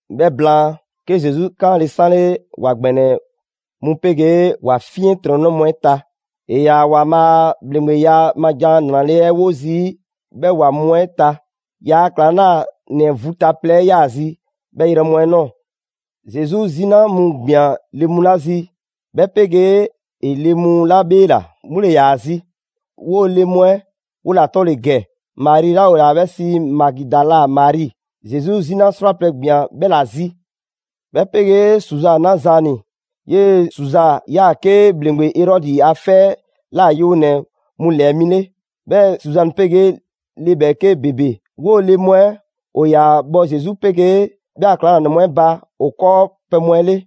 'Bhɛ blaan, 'ke Zesu 'kaanle‑ 'sanle ‑wa ‑gbɛnɛ mu 'pegee ‑wa 'fiɛntrɔnnɛ mu 'ɛ ta. 'E ‑yaa ‑Waanbhaa' a ‑bhleŋgbeya ma ‑jan 'nrale‑ 'ɛ 'wo zii' 'bhɛ ‑wa mu 'ɛ ta. ‑Yaa' ‑klaŋlanɛ vu ta plɛ 'ɛ 'yaa‑ zi 'bhɛ yrɛ mu 'ɛ ꞊nɔɔ. Zesu 'zina mu ꞊gbian le mu 'la zi, 'bhɛ 'pegee ‑e le mu 'la 'bheela‑, 'mu ‑le ‑yaa zi. 'Woo‑ le mu 'ɛ 'wo ‑la 'tɔ ‑le ‑gɛ: Mari 'la ‑o ‑yaa 'bhɛ sii Magidala Mari, Zesu 'zina 'srwaplɛ‑ ‑gbian 'bhɛ ‑la zi. 'Bhɛ 'pegee Suza 'na Zaani: 'yee‑ Suza ‑yaa 'ke ‑bhleŋgbe Erɔdi a 'fɛ 'ɛ ꞊la yewonɛ mu ‑lɛɛ mi 'le; 'bhɛɛ‑ Suzani 'pegee le ‑bhɛɛke' ‑bebe. 'Woo‑ le mu 'ɛ ‑o ‑yaa bhɔ Zesu 'pegee 'bhɛ a ‑klaŋlanɛ mu 'ɛ ba ‑o 'kɔɔpɛ‑ mu 'ɛ 'le.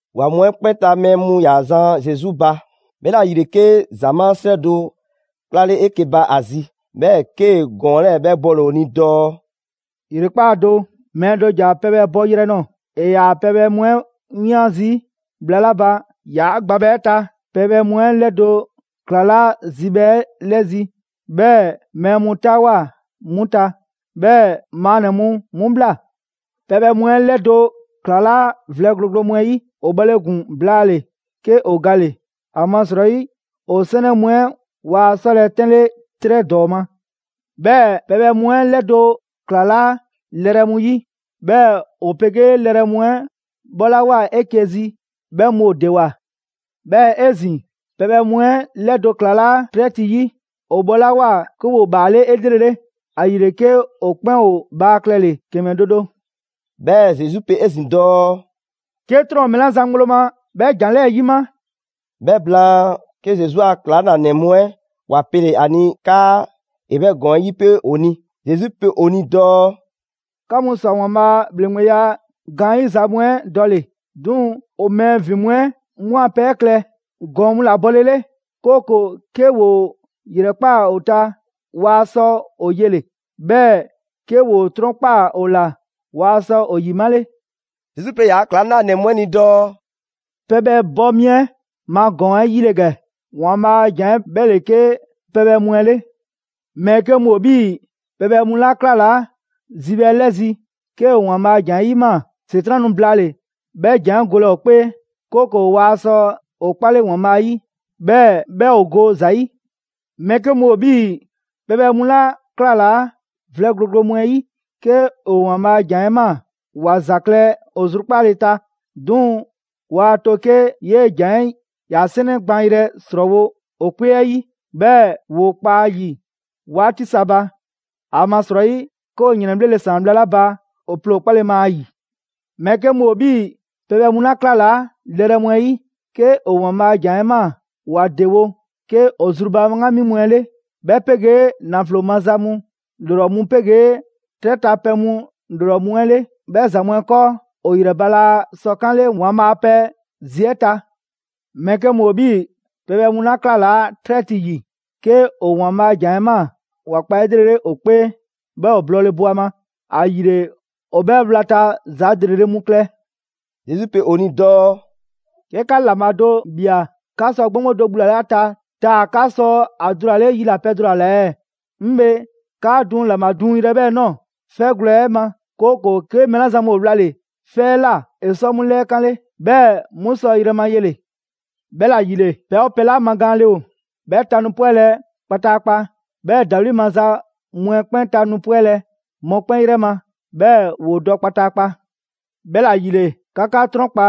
‑Wa mu 'ɛ 'kpɛn ta mɛɛ mu 'yaa‑ zan Zesu ba. 'Bhɛla‑ ‑yile 'ke ‑zamaa' 'srɛ do 'klale 'eke‑ ba ‑a zi. 'Bhɛɛ‑ 'kee‑ ‑gɔɔn 'lɛɛ‑ 'bhɛ bɔle‑ ‑o ni dɔɔ: «‑Yrekpaa' do, mɛɛ do ‑ja pɛbhɛ bɔyrɛ nɔɔ‑. ‑E ‑yaa pɛbhɛ mu 'ɛ 'wian zii' bhla 'la ba ‑yaa' gbabhɛ 'ɛ ta, pɛbhɛ mu 'ɛ 'lɛdo‑ 'klalaa‑ zibhɛ 'ɛ 'lɛzi‑, 'bhɛɛ‑ mɛɛ mu 'taawoa꞊ 'mu ta, 'bhɛɛ‑ maannɛ‑ mu 'mu ‑bhla. Pɛbhɛ mu 'ɛ 'lɛdo‑ ‑klalaa' vlɛ gloglo mu 'ɛ 'yi. ‑O bhɔle ‑gun blaale‑ 'ke ‑o gale‑, ‑amasrɔyi ‑o 'sɛnɛ mu 'ɛ waa 'sɔlɛ‑ 'tɛnle 'trɛ ‑dɔɔ ma. 'Bhɛɛ‑ pɛbhɛ mu 'ɛ 'lɛdo‑ ‑klalaa' lɛrɛ mu 'yi. 'Bhɛɛ‑ ‑o 'pegee lɛrɛ mu 'ɛ 'bhɔlawoa 'eke‑ zi, 'bhɛ mu ‑o ‑dewoa. 'Bhɛɛ‑ 'ezin‑, pɛbhɛ mu 'ɛ 'lɛdo‑ ‑klalaa' 'trɛ ti 'yi. ‑O bhɔlawoa 'ke ‑woo ‑bhaale' 'elrele. ‑Ayile 'ke ‑o 'kpɛn ‑o bhaa klɛle‑ ‑kɛmɛ do do.» 'Bhɛɛ‑ Zesu pe 'ezin‑ dɔɔ: «'Ke 'trɔn ‑o mɛɛ 'la zan ŋgblo ma 'bhɛ ‑jan 'lɛɛ‑ 'yima!» 'Bhɛ blaan, 'ke Zesu a ‑klaŋlanɛ mu 'ɛ ‑wa pele‑ ‑a ni 'kaa ‑e 'bhɛ ‑gɔɔn 'ɛ 'yipe ‑o ni. Zesu pe ‑o ni dɔɔ: «'Ka mu ‑swa ‑Waanbhaa' a ‑bhleŋgbeya gaanyiza mu 'ɛ dɔle‑. 'Duŋ‑ ‑o mɛɛ ‑vin mu 'ɛ 'mu a pɛ 'ɛ klɛ ‑gɔɔn mu ‑la bɔlele; 'kooko‑ 'ke ‑woo ‑yrɛkpaa ‑o ta waa sɔ ‑o yele‑, 'bhɛɛ‑ 'ke ‑woo 'trɔnkpaa‑ ‑o ‑la, waa sɔ ‑o ‑yimale.» Zesu pe ‑yaa' ‑klaŋlanɛ mu 'ɛ ni dɔɔ: «Pɛbhɛ bɔ mi 'ɛ ma ‑gɔɔn 'ɛ 'yi ‑le ‑gɛ: ‑Waanbhaa' ‑jan 'ɛ 'bhɛ ‑le 'ke pɛbhɛ mu 'ɛ 'le. Mɛɛ 'ke mu ‑o 'bhii‑ pɛbhɛ mu 'la 'klalaa zibhɛ 'ɛ 'lɛzi‑. 'Ke ‑o ‑Waanbhaa' a ‑jan 'ɛ ꞊maa, ‑Setran' nu blaale‑ 'bhɛ ‑jan 'ɛ golɛ ‑o 'kpee, 'kooko‑ waa sɔ ‑o 'kpale ‑Waanbhaa' 'yi, 'bhɛɛ‑ 'bhɛ ‑o go ‑za 'yi. Mɛɛ 'ke mu ‑o 'bhii‑ pɛbhɛ mu 'la 'klalaa vlɛ gloglo mu 'ɛ 'yi. 'Ke ‑o ‑Waanbhaa' a ‑jan 'ɛ ꞊maa ‑wa ‑za klɛ ‑o zrukpaale ta. 'Duŋ‑ waa to 'ke 'yee‑ ‑jan 'ɛ ‑ya 'sɛnɛ gbaanyrɛ ‑srɔɔwo ‑o 'kpee 'ɛ 'yi, 'bhɛɛ‑ ‑woo kpa a ‑yi 'waati sa ba. ‑Amasrɔyi 'ke ‑o ‑yrɛnbhlele ‑saan bhla 'la ba ‑o ploo ‑o 'kpale‑ ma ‑a ‑yi. Mɛɛ 'ke mu ‑o 'bhii‑ pɛbhɛ mu 'la 'klalaa lɛrɛ mu 'ɛ 'yi. 'Ke ‑o ‑Waanbhaa' ‑jan 'ɛ ꞊maa, ‑wa ‑dewo' 'ke ‑o zru ba 'ŋgami mu 'ɛ 'le, 'bhɛ 'pegee ‑naflo maza mu ‑lrɔ mu 'pegee 'trɛ ta pɛ mu ‑lrɔ mu 'ɛ 'le. 'Bhɛ ‑za mu 'ɛ 'kɔɔ, ‑o ‑yrɛ ba laa sɔ 'kanle ‑Waanbhaa' a pɛ zi 'ɛ ta. Mɛɛ 'ke mu ‑o 'bhii‑ pɛbhɛ mu 'la 'klalaa 'trɛ ti ‑yi. 'Ke ‑o ‑Waanbhaa' a ‑jan 'ɛ ꞊maa, ‑wa kpa 'elrele ‑o 'kpee, 'bhɛɛ‑ ‑o blɔɔle bo ‑a ma. ‑Ayile ‑o 'bhɛ 'wlata‑ za ‑lrele' mu klɛ.» Zesu pe ‑o ni dɔɔ: «'Ke 'ka ‑laŋbha do ꞊bhia 'ka sɔ 'gboŋgbo do bhulale ‑a ta taa‑ 'ka sɔ ‑a dulale yilapɛ do ‑la ꞊la ɛɛ? 'Ŋ bhe, 'kaa duŋ ‑laŋbha duŋyrɛ 'ɛ 'bhɛ ꞊nɔɔ 'fɛgwlɛ‑ 'ɛ ma, 'kooko‑ 'ke mɛɛ 'la zan mu ‑o wlale‑ 'fɛ 'ɛ ꞊la ‑e sɔ 'mu 'lɛɛ 'kanle, 'bhɛɛ‑ 'mu sɔ yrɛ ma yele‑. 'Bhɛla‑ ‑yile, pɛ 'oo pɛ 'la magaanle ‑o, 'bhɛ ta nu 'pwɛlɛ‑ kpataakpa, 'bhɛɛ‑ ‑dawli' maza mu 'ɛ 'kpɛn ta nu 'pwɛlɛ‑ mɔkpɛn' 'yrɛ ma, 'bhɛɛ‑ ‑woo dɔ kpataakpa. 'Bhɛla ‑yile, 'ka 'ka 'trɔnkpa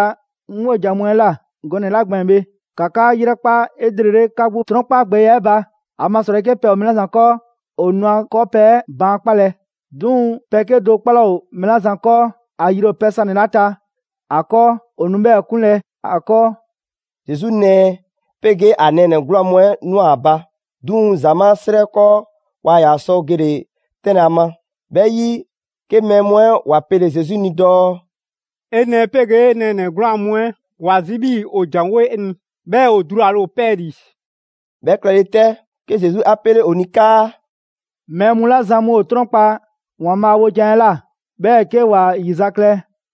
'ŋ 'wojan‑ mu 'ɛ ꞊la gɔnɛ‑ 'la gbɛɛn‑ bhe, ‑ka 'ka 'yrɛkpa 'elrele 'ka 'gbu 'trɔnkapgbɛya 'ɛ ba. ‑Amasrɔyi 'ke pɛ ‑o mɛɛ 'la zan 'kɔɔ ‑o nu ‑a 'kɔɔpɛ‑ 'ɛ baan' 'kpalɛ‑. 'Duŋ‑ pɛ 'kedo‑ 'kpɔ 'laa ‑o mɛɛ 'la zan 'kɔɔ, ‑a yri ‑o pɛ sanɛ‑ 'la ta ‑a 'kɔɔ, ‑o nu 'bhɛɛ‑ 'kunlɛ‑ 'a 'kɔɔ.» Zesu nɛɛ 'pegee ‑a nɛɛnɛ‑ 'gwlaan‑ mu 'ɛ ꞊nwa ‑a ba, 'duŋ‑ ‑zamaa' 'srɛ 'ɛ 'kɔɔ, waa ‑yaa sɔ gele‑ 'tɛnlɛ‑ ‑a ma. 'Bhɛ 'yi, 'ke mɛɛ mu 'ɛ ‑wa pele‑ Zesu ni dɔɔ: «'E nɛɛ 'pegee 'e nɛɛnɛ‑ 'gwlaan‑ mu 'ɛ ‑wa zi 'bhii‑ ‑o ‑janwo' 'e ni, 'bhɛɛ‑ ‑o dulale ‑o 'pɛɛlii‑.» 'Bhɛ klɛle 'tɛ, 'ke Zesu 'a 'pele ‑o ni 'kaa: «Mɛɛ mu 'la zan mu ‑o 'trɔnkpa‑ ‑Waanbhaa' wojan 'ɛ ꞊la, 'bhɛɛ‑ 'ke ‑wa ‑yizaklɛ,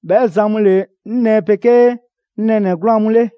'bhɛ zan mu ‑le 'ŋ nɛɛ 'pegee 'ŋ nɛɛnɛ‑ 'gwlaan‑ mu 'le.»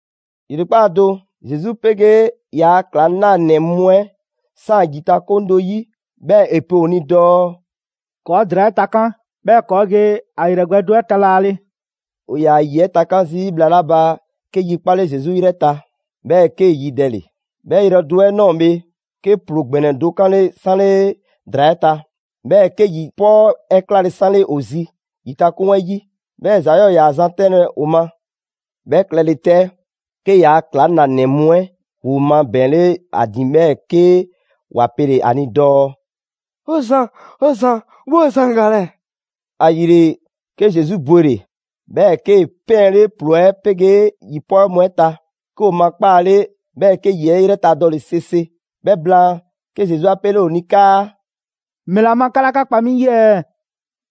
‑Yrekpaa' do, Zesu 'pegee ‑yaa' ‑klaŋlanɛ mu 'ɛ ‑saan ‑yitakoŋ do 'yi, 'bhɛɛ‑ ‑e pe ‑o ni dɔɔ: «‑Kɔɔ' ‑draa 'ɛ takan', 'bhɛɛ‑ ‑kɔɔ' ge ‑a 'yrɛ gbɛ do 'ɛ ta laale.» ‑O ‑yaa ‑yi 'ɛ takan' zii' bhla 'la ba 'ke yi 'kpale‑ Zesu 'yrɛ ta, 'bhɛɛ‑ 'kee‑ yidɛle. 'Bhɛ yrɛ do 'ɛ ꞊nɔɔ bhe, 'ke ‑ploo ‑gbɛnɛ do 'kanle 'sanle ‑draa 'ɛ ta. 'Bhɛɛ‑ 'ke ‑yi 'pɔɔ 'ɛ 'klale‑ 'sanle ‑o zi ‑yitakoŋ 'ɛ 'yi, 'bhɛɛ‑ ‑za 'yɔɔ‑ ‑yaa zan 'tɛnlɛ‑ ‑o ma. 'Bhɛ klɛle 'tɛ, 'ke ‑yaa' ‑klaŋlanɛ mu 'ɛ ‑woo mabɛɛnle ‑a ‑din, 'bhɛɛ‑ 'ke ‑wa pele‑ ‑a ni dɔɔ: «'O Zan, 'o Zan, 'woo‑ zan galɛ.» ‑Ayile, 'ke Zesu bwele‑, 'bhɛɛ‑ 'kee‑ 'pɛɛnle ‑ploo 'ɛ 'pegee ‑yi 'pɔɔ mu 'ɛ ta, 'ke ‑o makpaale, 'bhɛɛ‑ 'ke ‑yi 'ɛ 'yrɛ ta dɔle‑ 'sese. 'Bhɛ blaan, 'ke Zesu 'a pele ‑o ni 'kaa: «‑Mɛla ma 'ka 'laa 'ka kpa 'mi 'yi ɛɛ?»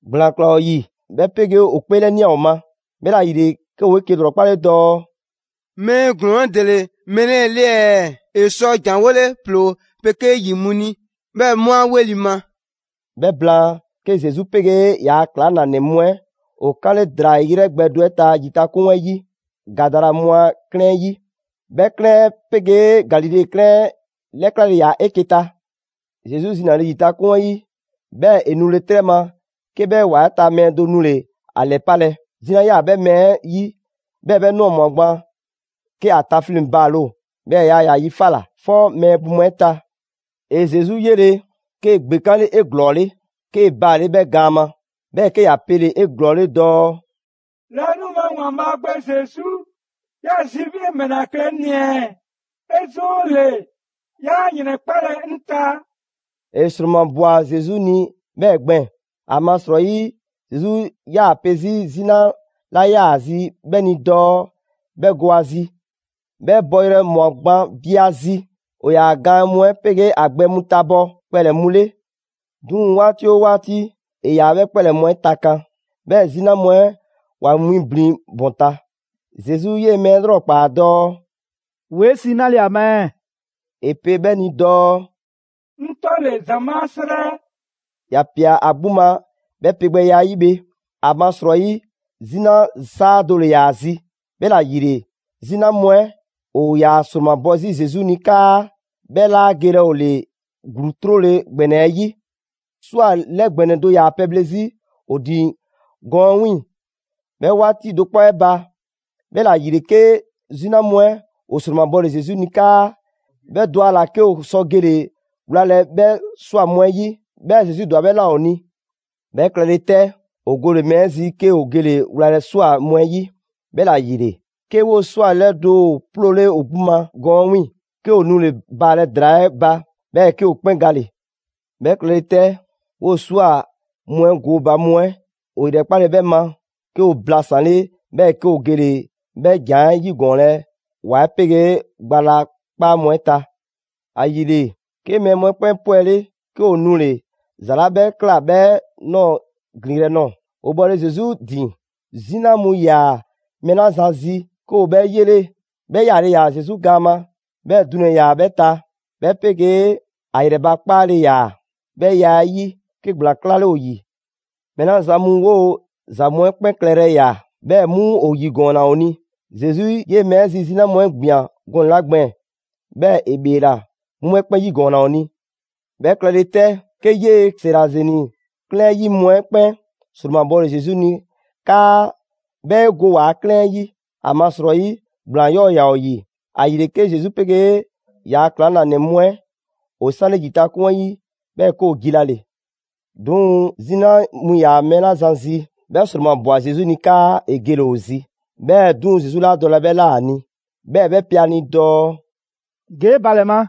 ‑Gblaan ꞊klaa ‑o ‑yi, 'bhɛ 'pegee ‑o 'kpeelɛnia ‑o ma. 'Bhɛla‑ ‑yile, 'ke ‑woo 'eke‑ ‑lrɔkpale dɔɔ: «Mɛɛ ‑glɔɔn 'ɛ ‑dele mɛɛ 'lɛɛ‑ 'le ɛɛ? ‑E sɔ ‑janwole ‑ploo 'pegee ‑yi mu ni, 'Bhɛɛ‑ 'mu 'a 'weli‑ ma!» 'Bhɛ blaan, 'ke Zesu 'pegee ‑yaa' ‑klaŋlanɛ mu 'ɛ ‑o 'kanle ‑draa 'yrɛ gbɛ do 'ɛ ta ‑yitakoŋ 'ɛ 'yi, Gadara mu a 'klɛɛn 'ɛ 'yi. 'Bhɛ 'klɛɛn 'ɛ 'pegee Galile 'klɛɛn 'ɛ 'lɛklale ‑yaa 'eke‑ ta. Zesu zinale ‑yitakoŋ 'ɛ 'yi, 'bhɛɛ‑ ‑e nule 'trɛ ma 'ke 'bhɛ ‑wa 'ɛ ta mɛɛ do nule‑ ‑a 'lɛpalɛ. 'Zina 'yaa‑ 'bhɛ mɛɛ 'ɛ zi, 'bhɛɛ‑ 'bhɛ ꞊nɔɔ ꞊mwa gban 'ke ‑a tafleŋ‑ baale ‑o. 'Bhɛɛ‑ yaa ‑yaa yi 'fa ꞊la, 'fɔ mɛɛ bu mu 'ɛ ta. ‑E Zesu 'yele‑, 'kee‑ ‑gbekanle 'eglɔɔle, 'kee‑ baale' 'bhɛ gaan ma, 'bhɛɛ‑ 'ke ‑ya pele‑ 'eglɔɔle dɔɔ: «Laanima ‑Waanbhaa' Gbe Zesu, ꞊ya zi 'bhii‑ 'e ‑mɛla klɛ 'ŋ ni ɛɛ? 'E 'zoole‑ 'yaa ‑yrɛnkpalɛ 'ŋ ta.» ‑E ‑sromabwa Zesu ni 'bhɛɛ‑ gbɛɛn‑, ‑amasrɔyi Zesu 'yaa‑ pe 'zi 'zina 'la 'yaa‑ ‑a zi 'bhɛ ni dɔɔ 'bhɛ go ‑a zi. 'Bhɛ bɔyrɛ ꞊mwa gban bi ‑a zi. ‑O ‑yaa ‑a gaan mu 'ɛ 'pegee ‑a gbɛ mu tabɔ kpɛlɛ‑ mu 'le. 'Duŋ‑ 'waati 'oo 'waati, ‑e ‑yaa 'bhɛ kpɛlɛ‑ mu 'ɛ takan, 'bhɛɛ‑ 'zina mu 'ɛ ‑wa winblin ‑bɔn ta. Zesu 'yee‑ mɛɛ 'ɛ 'lrɔkpaa‑ dɔɔ: «‑Woo' 'ɛ sii 'nale‑ ‑a ma ɛɛ?» ‑E pe 'bhɛ ni dɔɔ: «'Ŋ 'tɔ ‑le: ‑Zamaa' 'srɛ.» ‑Ya ꞊pia ‑a 'gbu ma 'bhɛ 'pegbɛya 'ɛ 'yi bhe, ‑amasrɔyi 'zina 'saa do ‑le ‑yaa ‑a zi. 'Bhɛla‑ ‑yile, 'zina mu 'ɛ ‑o ‑yaa ‑sromabɔ 'zi Zesu ni 'kaa 'bhɛ 'laa gelɛ ‑o ‑le ‑gluu 'trole‑ ‑gbɛnɛ 'ɛ 'yi. ꞊Swa 'lɛ ‑gbɛnɛ do ‑yaa pɛbhle zii' ‑o ‑din gɔɔnɛ‑ 'ɛ 'wiiŋ‑ 'bhɛ 'waati do 'kpɔ 'ɛ ba. 'Bhɛla‑ ‑yile 'ke 'zina mu 'ɛ ‑o ‑sromabɔle Zesu ni 'kaa 'bhɛ dɔ ‑a ‑la 'ke ‑o sɔ gele‑ wlalɛ 'bhɛ ꞊swa mu 'ɛ 'yi. 'Bhɛɛ‑ Zesu ‑dwa 'bhɛ ꞊la ‑o ni. 'Bhɛ klɛle 'tɛ, ‑o gole‑ mɛɛ 'ɛ zi, 'ke ‑o gele‑ wlalɛ ꞊swa mu 'ɛ 'yi. 'Bhɛla‑ ‑yile, 'ke 'woo‑ ꞊swa 'lɛdo‑ ‑o 'ploole ‑o 'gbu ma gɔɔn 'ɛ 'wiiŋ‑, 'ke ‑o nule‑ baalɛ ‑draa 'ɛ ba, 'bhɛɛ‑ 'ke ‑o 'kpɛn gale‑. 'Bhɛ klɛle 'tɛ, 'woo‑ ꞊swa mu 'ɛ gooba mu 'ɛ ‑o ‑yrɛkpale 'bhɛ ma, 'ke ‑o blasanle, 'bhɛɛ‑ 'ke ‑o gele‑ 'bhɛ ‑jan 'ɛ 'yigɔɔnlɛ ‑wa 'ɛ 'pegee gba la 'kpaa mu 'ɛ ta. ‑Ayile, 'ke mɛɛ mu 'ɛ 'kpɛn 'pwɛle, 'ke ‑o nule‑ ‑za 'la 'bhɛ ꞊kla 'bhɛ ꞊nɔɔ ‑glinyrɛ' nɔɔ‑. ‑O bhɔle Zesu ‑din, 'zina mu ‑yaa mɛɛ 'la zan zi, 'ke ‑o 'bhɛ 'yele. 'Bhɛ 'yaale‑ ‑yaa Zesu gaan ma, 'bhɛɛ‑ dunɛ‑ ‑yaa 'bhɛ ta, 'bhɛ 'pegee ‑a ‑yrɛ ba 'kpaale‑ ‑yaa. 'Bhɛ ya 'ɛ 'yi, 'ke ‑gblaan 'klale ‑o ‑yi. Mɛɛ 'la zan mu 'woo‑ ‑za mu 'ɛ 'kpɛn klɛyrɛ ꞊ya, 'bhɛ mu ‑o 'yigɔɔnna ‑o ni. Zesu 'yee‑ mɛɛ 'ɛ zi 'zina mu 'ɛ ‑gbian gɔnɛ‑ 'la gbɛɛn‑ 'bhɛɛ‑ ‑e ‑bheela, 'mu 'bhɛ 'kpɛn 'yigɔɔnna ‑o ni. 'Bhɛ klɛle 'tɛ, 'ke 'yee‑ Zerazeni 'klɛɛn 'ɛ 'yi mu 'ɛ 'kpɛn ‑sromabɔle Zesu ni 'kaa 'bhɛ 'e go ‑waa' 'klɛɛn 'ɛ 'yi. ‑Amasrɔyi ‑gblaan 'yɔɔ‑ ‑yaa ‑o ‑yi. ‑Ayile 'ke Zesu 'pegee ‑yaa ‑klaŋlanɛ mu 'ɛ ‑o 'sanle ‑yitakoŋ 'ɛ 'yi, 'bhɛɛ‑ 'ke ‑o jilale. 'Duŋ‑ 'zina mu ‑yaa mɛɛ 'la zan zi, 'bhɛ ‑sromabwa Zesu ni 'kaa ‑e gele‑ ‑o zi. 'Bhɛɛ‑ 'duŋ‑ Zesu 'laa dɔlɛ 'bhɛ ꞊la ‑a ni, 'bhɛɛ‑ 'bhɛ pe ‑a ni dɔɔ: «Ge 'e ba ‑lɛ ma,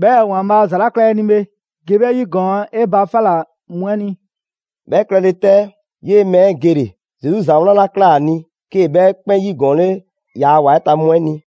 'bhɛɛ‑ ‑Waanbhaa' ‑za 'la ꞊kla 'e ni bhe, ge 'bhɛ 'yigɔɔn 'e ba 'fa ꞊la mu 'ɛ ni.» 'Bhɛ klɛle 'tɛ, 'yee‑ mɛɛ 'ɛ gele, Zesu ‑za wlan 'la ꞊kla ‑a ni, 'kee‑ 'bhɛ 'kpɛn 'yigɔɔnle ‑yaa ‑wa 'ɛ ta mu 'ɛ ni.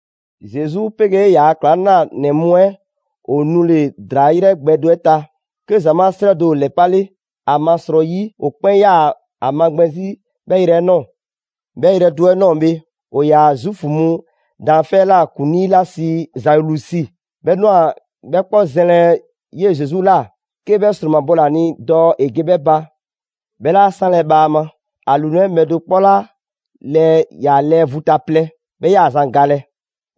Zesu 'pegee ‑yaa ‑klaŋlanɛ mu 'ɛ ‑o nule ‑draa 'yrɛ gbɛ do 'ɛ ta, 'ke ‑zamaa' 'srɛ do ‑o ‑lɛpale, ‑amasrɔyi ‑o 'kpɛn 'yaa‑ ‑a magbɛn 'zi 'bhɛɛ‑ yrɛ 'ɛ ꞊nɔɔ. 'Bhɛ yrɛ do 'ɛ ꞊nɔɔ bhe, ‑o ‑yaa Zuufu mu daanfɛ' 'ɛ ꞊la ‑kuŋlii 'la sii Zailusi 'bhɛ ꞊nwa 'bhɛ 'kpɔ zɛnlɛ 'yee‑ Zesu ꞊la, 'ke 'bhɛ 'sromabɔle ‑a ni dɔɔ ‑e ge 'bhɛ ba. 'Bhɛ 'laa 'sanle‑ bhaama: ‑A ‑lunɛ' bhɛ do 'kpɔ 'la lɛɛ ‑yaa lɛɛ vu ta plɛ, 'bhɛ 'yaa‑ zan galɛ.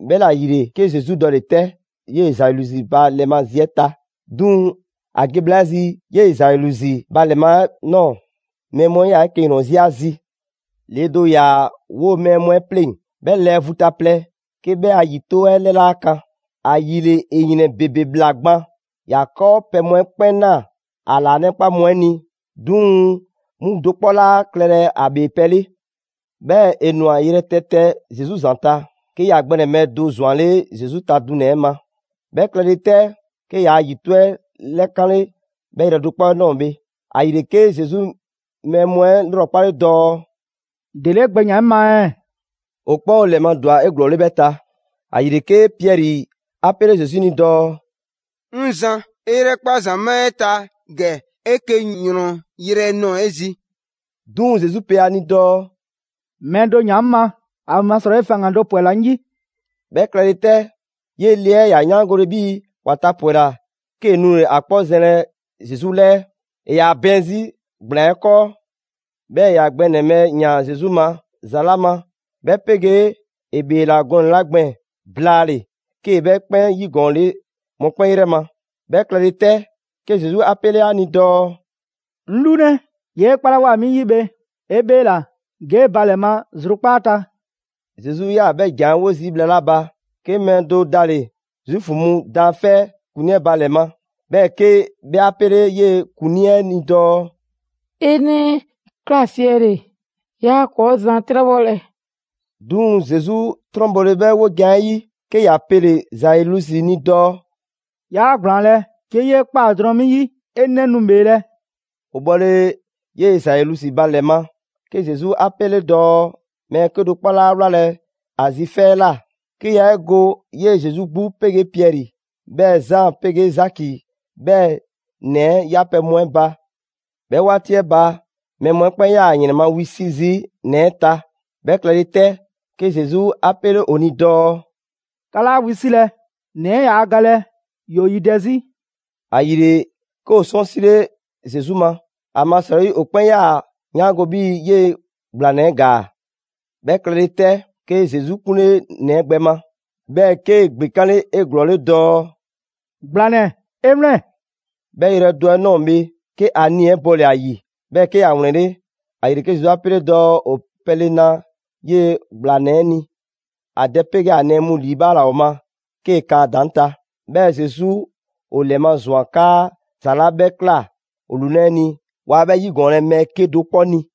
'Bhɛla‑ ‑yile, 'ke Zesu dɔle‑ 'tɛ 'yee‑ Zailusi ba ‑lɛ ma zi 'ɛ ta. 'Duŋ‑, ‑a ge bhla 'ɛ 'zi 'yee‑ Zailusi ba ‑lɛ ma 'ɛ ꞊nɔɔ, mɛɛ mu 'ɛ 'yaa‑ 'eke‑ ‑yrɔn 'zi ‑a zi. Le do ‑yaa 'woo‑ mɛɛ mu 'ɛ 'pleŋ‑, 'bhɛ lɛɛ vu ta plɛ 'ke 'bhɛ a ‑yito' 'ɛ 'lɛ 'laa kan, ‑ayile ‑e ‑yrɛn ‑bebe ꞊bhla gban. ‑Ya 'kɔɔpɛ‑ mu 'ɛ 'kpɛn ꞊naa ‑a ‑laanɛkpa mu 'ɛ ni, 'duŋ‑ 'mu do 'kpɔ 'laa klɛlɛ ‑a ‑bhee pɛ 'le. 'Bhɛɛ‑ ‑e ‑nwa yrɛtɛtɛ Zesu ‑zanta' 'ke ‑ya gbɛ ‑nɛbhɛ' do ‑zwanle' Zesu ta dunɛ‑ 'ɛ ma. 'Bhɛ klɛle 'tɛ, 'ke yaa ‑yito' 'ɛ 'lɛkanle 'bhɛ yrɛ do 'kpɔ ɛ ꞊nɔɔ bhe. ‑Ayile, 'ke Zesu mɛɛ mu 'ɛ 'lrɔkpale dɔɔ: «‑Dele 'e gbɛ ‑yaan 'ŋ ma ɛɛ?» ‑O 'kpɛn ‑o ‑lɛ ma ‑dwa 'eglɔɔle 'bhɛ ta. ‑Ayile 'ke Piɛri 'a 'pele Zesu ni dɔɔ: «'Ŋ zan, 'e 'yrɛkpa ‑zamaa' 'ɛ ta ‑gɛ 'eke‑ ‑yrɔn yrɛ ꞊nɔɔ 'e zi.» 'Duŋ‑ Zesu pe ‑a ni dɔɔ: «Mɛɛ do ‑yaan 'ŋ ma, ‑amasrɔyi faŋgan‑ do ‑pwɛla 'ŋ 'yi.» 'Bhɛ klɛle 'tɛ, 'yee‑ le 'ɛ ‑ya 'yaangole 'bhii‑ ‑wa tapwɛla, 'kee‑ nule‑ ‑a 'kpɔ zɛnlɛ Zesu 'lɛɛ. ‑E ‑yaa bɛɛn 'zi ‑gblaan 'ɛ 'kɔɔ. 'Bhɛɛ‑ ‑ya gbɛ ‑nɛbhɛ' ‑yaan Zesu ma ‑za 'la ma, 'bhɛ 'pegee ‑e ‑bheela gɔnɛ‑ 'la gbɛɛn‑ blaale‑ 'kee‑ 'bhɛ 'kpɛn 'yigɔɔnle mɔkpɛn' 'yrɛ ma. 'Bhɛ klɛle 'tɛ, 'ke Zesu 'a 'pele ‑a ni dɔɔ: «'Ŋ 'lunɛ, 'yee 'e 'kpalawoa 'mi 'yi bhe, 'e bheela‑. Ge 'e ba ‑lɛ ma zrukpaa' ta.» Zesu 'yaa‑ 'bhɛ ‑jan 'ɛ 'wo zii' bhla 'la ba, 'ke mɛɛ do dale‑ Zuufu mu daanfɛ' 'ɛ ‑kuŋlii 'ɛ ba ‑lɛ ma, 'bhɛɛ‑ 'ke 'bhɛ 'a pele‑ 'yee‑ ‑kuŋlii 'ɛ ni dɔɔ: «'E 'nɛ 'ɛ ꞊kla siɛle‑, 'yaa ‑kɔɔ' Zan 'trɛbhɔlɛ.» 'Duŋ‑ Zesu 'trɔn bɔle 'bhɛ wojan 'ɛ 'yi, 'ke ‑ya pele‑ Zailusi ni dɔɔ: «'Yaa ‑gblaanlɛ', 'ke 'yee ꞊kpa drɔŋ 'mi 'yi 'e 'nɛ nu ‑bheelɛ'.» ‑O bhɔle 'yee‑ Zailusi ba ‑lɛ ma, 'ke Zesu 'a pele‑ dɔɔ mɛɛ 'kedo‑ 'kpɔ 'laa wlalɛ ‑a zi 'fɛ 'ɛ ꞊la, 'ke yaa 'e go 'yee‑ Zesu 'gbu 'pegee Piɛri, 'bhɛɛ Zaan 'pegee Zaki, 'bhɛɛ‑ ‑nɛ 'ɛ 'yapɛ‑ mu 'ɛ ba. 'Bhɛ 'waati 'ɛ ba, mɛɛ mu 'ɛ 'kpɛn 'yaa‑ ‑yrɛn ma wisi' zii' ‑nɛ 'ɛ ta. 'Bhɛ klɛle 'tɛ, 'ke Zesu 'a 'pele ‑o ni dɔɔ: «'Ka 'laa wisilɛ, ‑nɛ 'ɛ yaa galɛ, ‑yoo yidɛ 'zi.» ‑Ayile, 'ke ‑o 'sɔnsile Zesu ma, ‑amasrɔyi ‑o 'kpɛn 'yaa‑ ‑a 'yaango‑ 'bhii‑ 'yee‑ ‑gblanɛ 'ɛ ‑gaa. 'Bhɛ klɛle 'tɛ, 'ke Zesu 'kunle ‑nɛ 'ɛ gbɛ ma, 'bhɛɛ‑ 'kee‑ ‑gbekanle 'eglɔɔle dɔɔ: «‑Gblanɛ, 'e 'wlɛn‑!» 'Bhɛ yrɛ do 'ɛ ꞊nɔɔ bhe, 'ke ‑a nii‑ 'ɛ bɔle‑ ‑a ‑yi, 'bhɛɛ‑ 'ke ‑ya ‑wlɛnle'. ‑Ayile 'ke Zesu 'a 'pele dɔɔ ‑o pɛle na 'yee‑ ‑gblanɛ 'ɛ ni. ‑A dɛ 'pegee ‑a nɛɛ mu ‑liibhaala ‑o ma 'kee‑ kan ‑a ‑daŋ' ta. 'Bhɛɛ‑ Zesu ‑o ‑lɛmazwan 'kaa ‑za 'la 'bhɛ ꞊kla ‑o lunɛ' 'ɛ ni waa 'bhɛ 'yigɔɔnlɛ mɛɛ 'kedo‑ 'kpɔ ni.